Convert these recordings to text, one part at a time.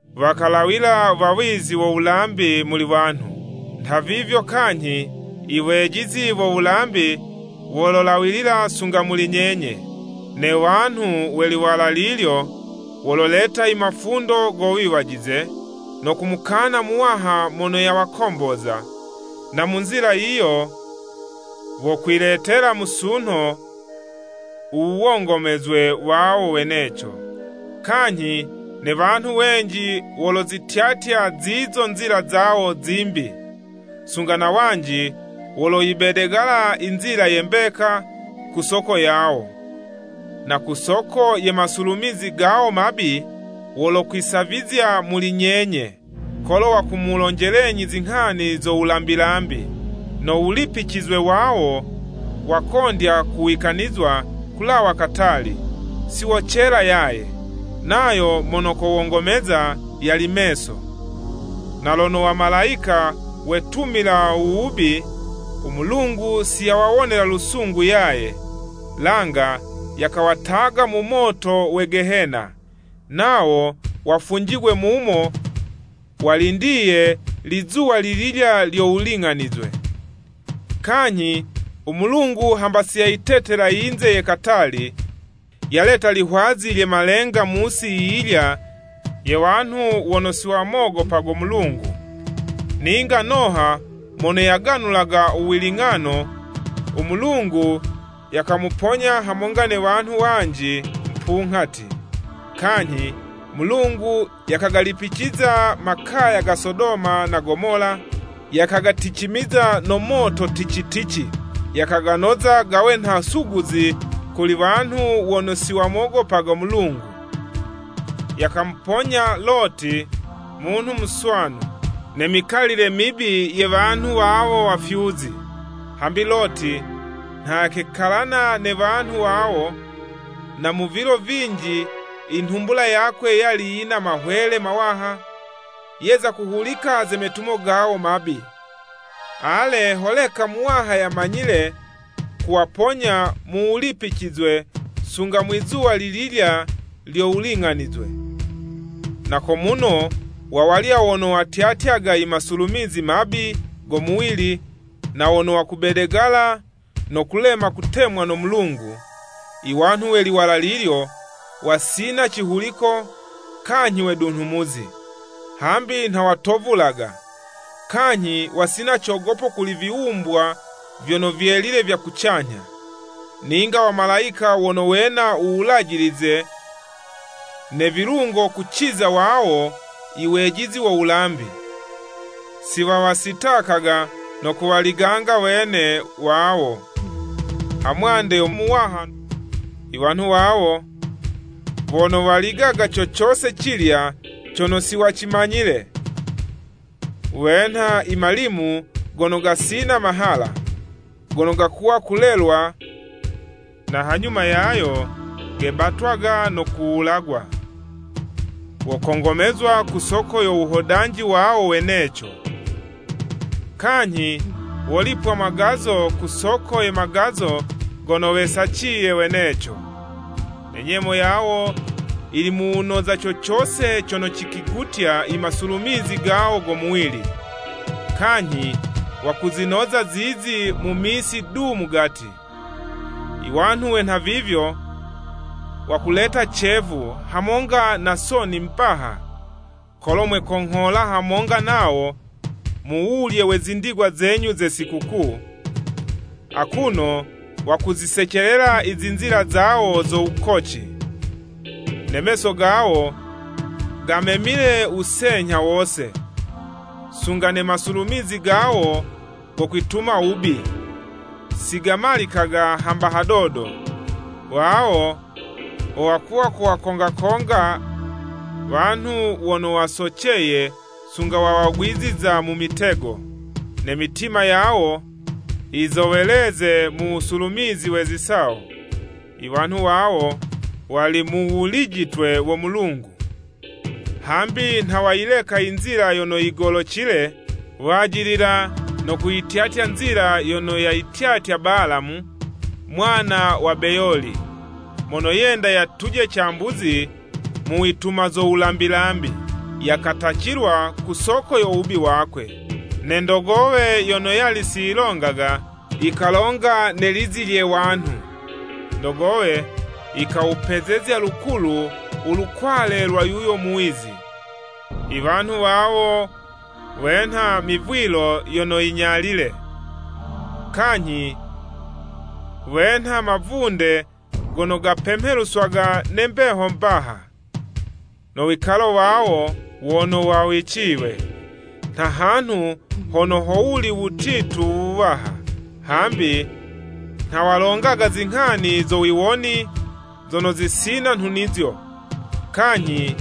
Wakalawila wawizi wo wulambi muli wanhu, nhavivyo kanyhi, iwejizi wo wulambi wololawila sunga na muli nyenye. Ne wanhu we liwala lilyo, wololeta i mafundo go wiwajize no kumukana Muwaha mono yakawakomboza, na mu nzila, yiyo wokwiletela musunho u wongomezwe wawo weneco. Kanyhi ne wanhu wenji wolozityatya zizo zinzila zawo zimbi, sunga na wanji woloyibedegala Inzila ye mbeka ku soko yawo. Na ku soko ye masulumizi gawo mabi, wolokwisavizya muli nyenye, kolo wakumulonjelenyi zinghani zo wulambi-lambi. No wulipicizwe wawo wakondya kuwikanizwa kulawa katali, siwocela yaye. Nayo mono kowongomeza, yali meso! Na lono wamalayika wetumila u wubi, u Mulungu si yawawonela lusungu yaye, langa yakawataga mu moto we Gehena, nawo wafunjigwe mumo walindiye Lizuwa lililya lyo wuling'anizwe. Kanyhi u Mulungu hamba siyayitetela yinze ye katali, yaleta lihwazi lye malenga mu'si yiyilya ye wanhu wono si wamogopago Mulungu, ninga Noha mono yaganulaga u wiling'ano, u Mulungu yakamuponya hamonga ne wanhu wanji mupunghati. Kanyhi Mulungu yakagalipiciza makaya ga Sodoma na Gomola, yakagaticimiza no moto tici-tici, yakaganoza gawe nha suguzi kuli wanhu wono siwamogopaga Mulungu. Yakamuponya Loti munhu muswanu, ne mikalile mibi ye muswanu, wanhu wawo wafyuzi. Hambi Loti nha yakekalana ne wanhu wawo, na mu vilo vinji, inhumbula yakwe yali yina mahwele mawaha, yeza kuhulika ze metumo gawo mabi. Ale, holeka, Muwaha yamanyile kuwaponya mu wulipicizwe sunga Mwizuwa lililya lyo wuling'anizwe. Na ko muno wa walya wono watyatyaga imasulumizi mabi go muwili na wono wakubedegala no kulema kutemwa no Mulungu. Iwanhu we liwala lilyo, wasina cihuliko kanyhi wedunhumuzi, hambi nha watovulaga, kanyhi wasina cogopo kuli viwumbwa vyono vyelile vya kucanyha. Ninga wamalayika wono wena u wulajilize ne vilungo kuciza wawo iwejizi wo wulambi, siwawasitakaga no kuwaliganga wene wawo hamwande yo Muwaha. Iwanhu wawo wono waligaga co cose cilya cono siwacimanyile, wenha i malimu gono gasina mahala, gono gakuwa kulelwa, na hanyuma yayo gebatagwa no kuwulagwa. Wokongomezwa ku soko yo wuhodanji wawo weneco. Kanyhi wolipwa magazo ku soko ye magazo gono wesaciye weneco. Ne nyemo yawo yili mu wunoza, co cose cono cikwigutya imasulumizi gawo go muwili, kanyhi wakuzinoza zizo mu misi du mugati. Iwanhu we nhavivyo wakuleta cevu hamonga na soni mbaha, kolo mwekonghola hamonga nawo, mu wulye we zindigwa zenyu ze zisikukuu, akuno wakuzisecelela i zinzila zawo zo wukoci. Ne meso gawo gamemile wusenyha wose, sunga ne masulumizi gawo go kwituma wubi, si gamalikaga hamba hadodo. Wawo wo wakuwa kuwakonga-konga wanhu wono wasoceye sunga wawagwiziza mu mitego. Ne mitima yawo yizoweleze mu wusulumizi we zisawo. Iwanhu wawo wali mu wulijitwe wo Mulungu! Hambi nha wayileka inzila yono yigolocile, wajilila no kuyityatya nzila yono yayityatya Balamu, mwana wa Beyoli, mono yenda yatuje cambuzi mu wituma zo wulambi-lambi, yakatacilwa ku soko yo wubi wakwe. Ne ndogowe yono siyilongaga, yikalonga ne lizi lye wanhu, ndogowe yikawupezezya lukulu ulukwale lwa yuyo muwizi. Iwanhu wawo wenha mivwilo yono yinyalile, kanyhi wenha mavunde gono gapemheluswaga ne mbeho mbaha, no wikalo wawo wono wawiciywe, nha hanhu hono howuli wutitu wuwaha. Hambi nha walongaga zinghani zo wiwoni zono zisina nhunizo, kanyhi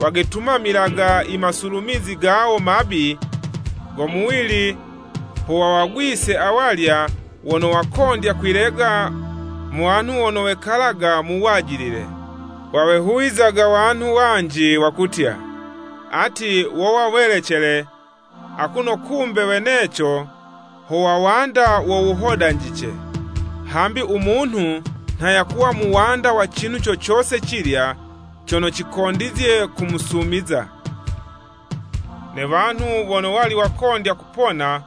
wegetumamilaga imasulumizi gawo mabi go muwili ho wawagwise awalya wono wakondya kwilega mu wanhu wono wekalaga mu wajilile. Wawehuwizaga wanhu wanji, wakutya, ati wowa welecele, akuno kumbe weneco ho wawanda wo wuhodanjice. Hambi u munhu nha yakuwa muwanda wa cinhu co cose cilya, cono cikondizye kumusumiza. Ne wanhu wono wali wakondya kupona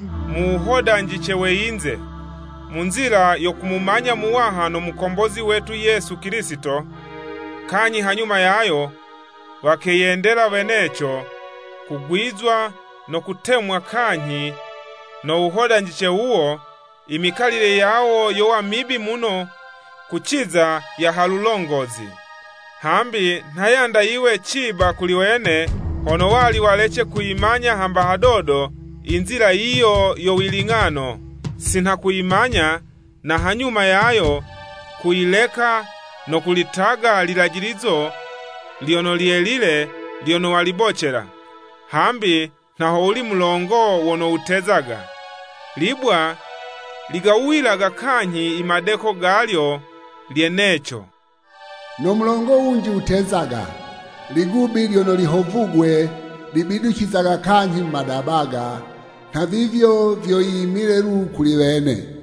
mu muwuhodanjice we yinze, mu nzila yo kumumanya Muwaha no Mukombozi wetu Yesu Kilisito, kanyhi hanyuma yayo, wakeyendela weneco kugwizwa no kutemwa kanyhi no wuhodanjice wuwo, i mikalile yawo yowa mibi muno kuciza ya halulongozi. Hambi nha yanda yiwe ciba kuli wene hono wali walece kuyimanya hamba hadodo, inzila yiyo yo wiling'ano, sinha kuyimanya, na hanyuma yayo, kuyileka no kulitaga lilajilizo lyono lyelile lyono walibocela. Hambi nha howuli mulongo wono wutezaga, Libwa ligawuyilaga kanyhi imadeko galyo lyeneco. “No mulongo wunji wutezaga, Ligubi lyono lihovugwe, libiducizaga kanyhi mu madabaga!” Nhavivyo vyo yimile lu kuli wene.